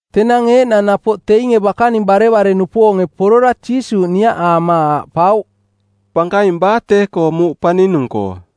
Tenang eeꞌnang napoꞌ teinge bakaning barevare-nupoonge porora Jiisuuꞌ niaꞌaama aaꞌpauꞌ, “Pankaing baa tee-koo muuꞌ paninung-koo?”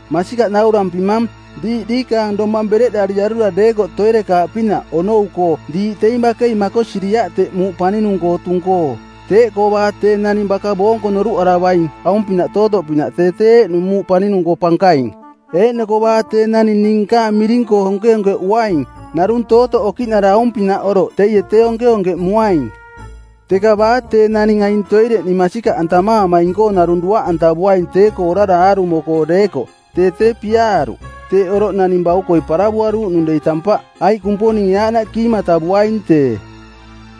“Masikaꞌ naurampimang, diiꞌ diikaang domang bereꞌdariarura deekoꞌ toirekaaꞌpinaꞌ onou-koo diiꞌ teing bakei makosiriaꞌ teꞌ muuꞌ paninung-koo tung-koo. Teeꞌkoo baa tee naning baka boonko noruꞌaravaing aung-pinaꞌ tootoꞌpinaꞌ tee tee eeꞌnung muuꞌ paninung-koo pankaing. Eeꞌnoko baa tee naning ning nkaang miring-koo onkeonkeꞌuaing narung tootoꞌ okiꞌnara aung-pinaꞌ oroꞌ teie tee onkeonkeꞌmuaing. “Teka Baa tee naning aing toireꞌ ning masikaꞌantamaamaing-koo narung duaꞌantavuaing tee-koo orara aarumo-koo deekoꞌ tee tee piaaruꞌ. Teeꞌ oroꞌ naning baukoi paravuaruuꞌnung dei tampaꞌ, aiꞌ Kumponinge aaꞌnaꞌ kiimatavuaing tee.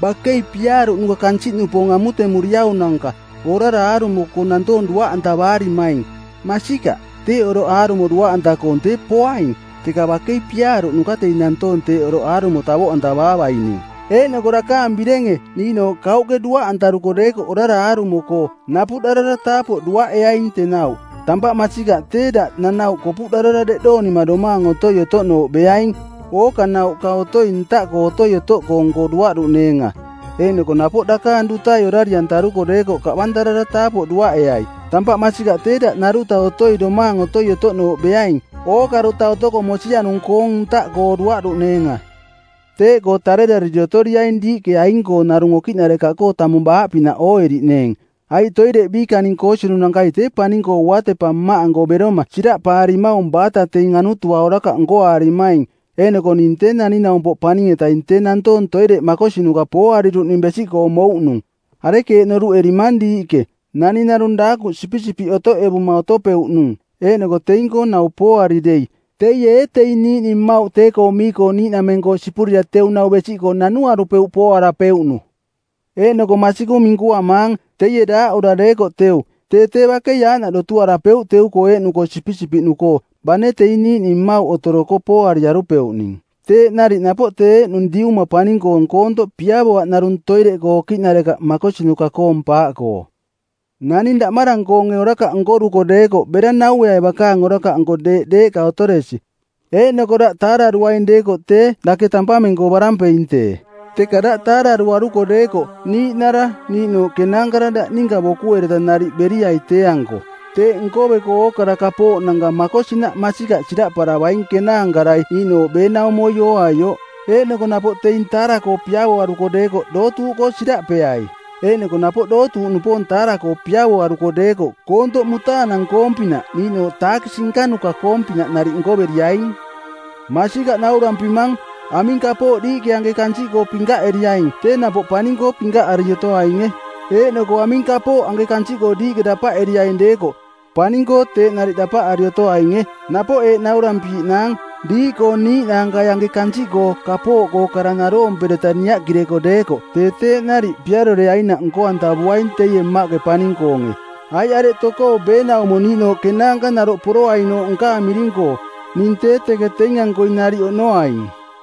Bakei piaaruꞌnuka kansiꞌnupoong amutemuriaunanka orara aarumo-koo nantoong duaꞌantavaarimaing. Masikaꞌ, teeꞌ oroꞌ aarumo duaꞌanta-koong tee poaing, teka bakei piaaruꞌnuka teing nantoong teeꞌ oroꞌ aarumo tavoꞌantavaavaining! “Eeꞌnoko dakaang birenge niiꞌnooꞌ kauꞌke duaꞌantaruko deekoꞌ orara aarumo-koo, napuꞌdarara taapoꞌ duaꞌeaing tenauꞌ. Tampaꞌ masikaꞌ tee daꞌ nanauꞌ kopuꞌdarara deꞌdoonima domaang otoi otoꞌnooꞌ beaing, ookanauꞌka otoi ntaꞌkoo otoi-otoꞌkoong-koo duaꞌduꞌneenga. Eeꞌnoko napoꞌ dakaang dutai orari-antaruko deekoꞌ kaꞌbantarara taapoꞌ duaꞌeai. Tampaꞌ masikaꞌ tee daꞌ naruta otoi domaang otoi otoꞌnooꞌ beaing, ookaruta otoko mosianung-koong ntaꞌkoo duaꞌdaaꞌneenga. Teeꞌkoo tarerariri otoriaing diiꞌke aing-koo narung okiꞌnarekaꞌkoo tamung baaꞌpinaꞌ ooeriꞌneeng, aiꞌ toireꞌ biikaning koosinunakai tee paning-koo uatepa Mmaꞌanko beroma siraꞌpaarimaung baata teing anutua orakaꞌ nkoaarimaing. “Eeꞌnoko ning Tee Naning-naumpoꞌ Paning-etaing tee nantoong toireꞌ makosinuka pooariruꞌning besiꞌkoo mouꞌnung. Arekeeꞌ noruꞌerimang diiꞌke, naning narung daakuꞌ sipisipiꞌ otoꞌevuma otopeuꞌnung eeꞌnoko teing-koo nau pooari dei, teie ee teing niiꞌning mmauꞌ tee-koo mii-koo niiꞌnameng-koo sipurira teu nau besiꞌkoo nanuarupeuꞌ pooarapeuꞌnu? Eeꞌnoko masikaꞌ minkuamaang, teie daaꞌura deekoꞌ teu, tee tee bakei aaꞌnaꞌ dotuarapeuꞌ teu-koo eeꞌnu-koo sipisipiꞌnu-koo, bane teing niiꞌning mmauꞌ otoroko pooariarupeuꞌning. Teeꞌ nariꞌ napoꞌ tee eeꞌnung Diuma paning-koong koontoꞌ piavoaꞌ narung toireꞌkoo okiꞌnarekaꞌ makosinuka-koong paaꞌkoo.” “Naning daꞌmarang-koonge orakaꞌ nkoruko deekoꞌ bera naueai bakaang orakaꞌnko deeꞌ deeꞌka otoresi, eeꞌnoko daꞌ taararuaing deekoꞌ tee dake tampameng-koo barampeing tee. Teka daꞌ taararuaruko deekoꞌ niiꞌnara niiꞌnooꞌ kenaankara daꞌ ninka bokuereta nariꞌ beriai tee-anko. Teeꞌ nkoveko ookara kapooꞌnanka makosinaꞌ masikaꞌ siraꞌparavaing kenaankarai niiꞌnooꞌ beenaumoi ooaioꞌ. Eeꞌnoko napoꞌ teing taara-koo piavoaruko deekoꞌ dootuuꞌkoo siraꞌpeai. Eeꞌnoko napoꞌ dootuuꞌnupoong taara-koo piavoaruko deekoꞌ koontoꞌ mutaanang-koong-pinaꞌ niiꞌnooꞌ taakisi nkanuka-koong-pinaꞌ nariꞌ nkoveriaing. Masikaꞌ naurampimang, aming kapooꞌ diiꞌke anke kansiꞌkoo pinkaꞌeriaing tee napoꞌ paning-koo pinkaꞌari otoainge, eeꞌnoko aming kapooꞌ anke kansiꞌkoo diiꞌke dapaꞌeriaing deekoꞌ, paning-koo teeꞌ nariꞌ dapaꞌari otoainge. Napoꞌ eeꞌ naurampiiꞌnaang, diiꞌkoo niiꞌnaankai anke kansiꞌkoo kapooꞌkoo kara naroompereta niaꞌkireko deekoꞌ tee teeꞌ nariꞌ piaroreainaꞌ nko-antavuaing teie Mmaꞌke paning-koonge. Aiꞌ areꞌ tokoo beenaumo niiꞌnooꞌ kenaanka naroꞌ poroainooꞌ nkaang miring-koo, ning tee teke teing-ankoi nariꞌ oꞌnoaing.”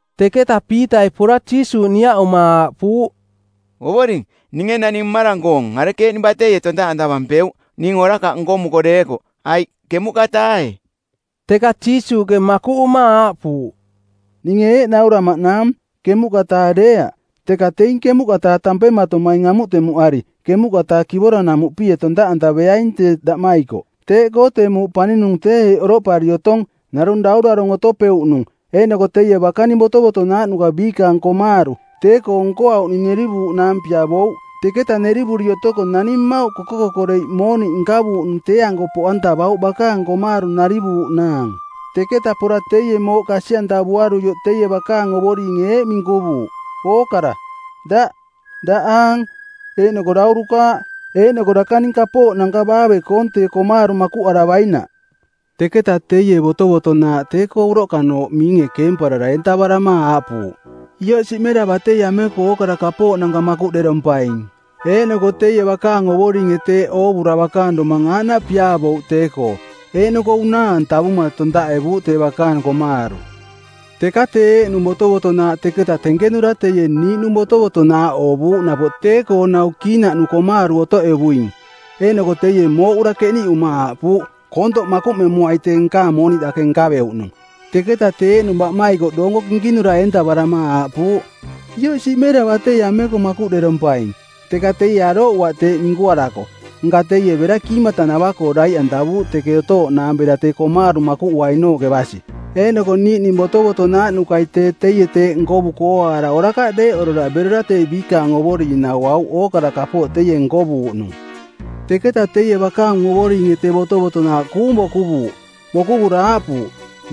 Teketa Piitai pora Jiisuuꞌ niaꞌuma aaꞌpuuꞌ, “Ovoring, ninge naning mmarang-koong arekeeꞌning bateie tontaꞌantavampeuꞌ ning orakaꞌ nkomuko deekoꞌ? Aiꞌ ˜kemuꞌka-taae?” Teka Jiisuuꞌke makuꞌuma aaꞌpuuꞌ, “Ninge eeꞌ nauramaꞌnaang, ˜kemuꞌka-taae deeaꞌ, teka teing ˜kemuꞌka-taa tampematomaing amutemuꞌari ˜kemuꞌka-taa kivora-namuꞌpie tontaꞌantaveaing tee daꞌmaikoꞌ. “Teeꞌkoo tee muuꞌ paninung tee eeꞌ oroꞌpari otong: Narung daurarong˜ otopeuꞌnung, eeꞌnoko teie bakaning botovotonaaꞌnuka biikaang komaaru˜ tee-koo nkoauꞌning nerivuuꞌnaang piavouꞌ. Teketa nerivuri otoko naning mmauꞌ koko-kokoreiꞌ mooniꞌ nkavuuꞌnung tee-anko poꞌantavauꞌ bakaang komaaru narivuuꞌnaang. Teketa pora teie mooꞌ kasi-antavuaruioꞌ teie bakaang ovoringe eeꞌ minkuvuuꞌ, ‘Ookara-daꞌ, daꞌaang, eeꞌnoko daurukaaꞌ, eeꞌnoko dakaning kapooꞌnanka baave-koong tee komaaru makuꞌaravainaꞌ.’ Teketa teie botovotonaaꞌ tee-koo uroꞌkanooꞌ miinge keemparara eentavarama aaꞌpuuꞌ, ‘Ioꞌ siꞌmera batei ameko ookara kapooꞌnanka makuꞌderompaing.’ Eeꞌnoko teie bakaang ovoringe teeꞌ oovura bakaang domang aaꞌnaꞌ piaavouꞌ tee-koo, eeꞌnoko unaa-antavuma tontaꞌevuuꞌ tee bakaang komaaru. Teka tee eeꞌnung botovotonaaꞌ teketa tenkenura teie niiꞌnung botovotonaaꞌ oovuuꞌ napoꞌ tee-koo nau kiinaꞌnu komaaru otoꞌevuing. Eeꞌnoko teie mooꞌura keniꞌuma aaꞌpuuꞌ, ‘Koontoꞌ makuꞌmemuai tee nkaang mooniꞌ dake nkaveuꞌnung!’ Teketa tee eeꞌnung baꞌmaikoꞌ doonko kinkinura eentavarama aaꞌpuuꞌ, ‘Ioꞌ siꞌmera batei ameko makuꞌderompaing.’ Teka teie arooꞌuaꞌ teeꞌ minkuarako, nka teie bera kiimatanava-koo daiꞌantavuuꞌ teke otooꞌnaang bera tee komaaru makuꞌuainooꞌke basi. Eeꞌnoko niiꞌning botovotonaaꞌnukai tee teie teeꞌ nkovuko ooaara orakaꞌ deeꞌorora berora tee biikaang ovoring nauauꞌ ookara kapooꞌ teie nkovuuꞌnung. Teketa teie bakaang ovoringe tee botovotonaaꞌ kuung bokuvuuꞌ. Bokuvura aaꞌpuuꞌ,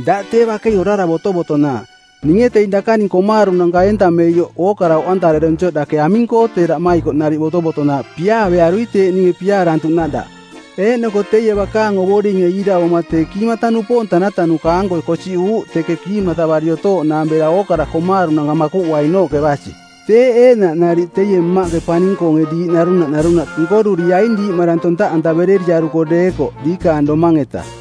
‘Daꞌ tee bakei orara botovotonaaꞌ! Ninge teing dakaning komaarunanka eentameioꞌ ookara oꞌantareronsioꞌ dake aming-koo tee daꞌmaikoꞌ nariꞌ botovotonaaꞌ piaavearui teeꞌ ninge piaarantuꞌnaꞌ daꞌ?’ Eeꞌnoko teie bakaang ovoringe iiravoma tee kiimata-nupoong tanatanuka-anko kosiꞌuuꞌ teke kiimatavari otooꞌnaang bera ookara komaarunanka makuꞌuainooꞌke basi. Teeꞌ eeꞌnaꞌ nariꞌ teie Mmaꞌke paning-koonge diiꞌ narunaꞌ narunaꞌ nkoruriaing diiꞌmarang tontaꞌantaverereriaruko deekoꞌ diikaang domang-eta.”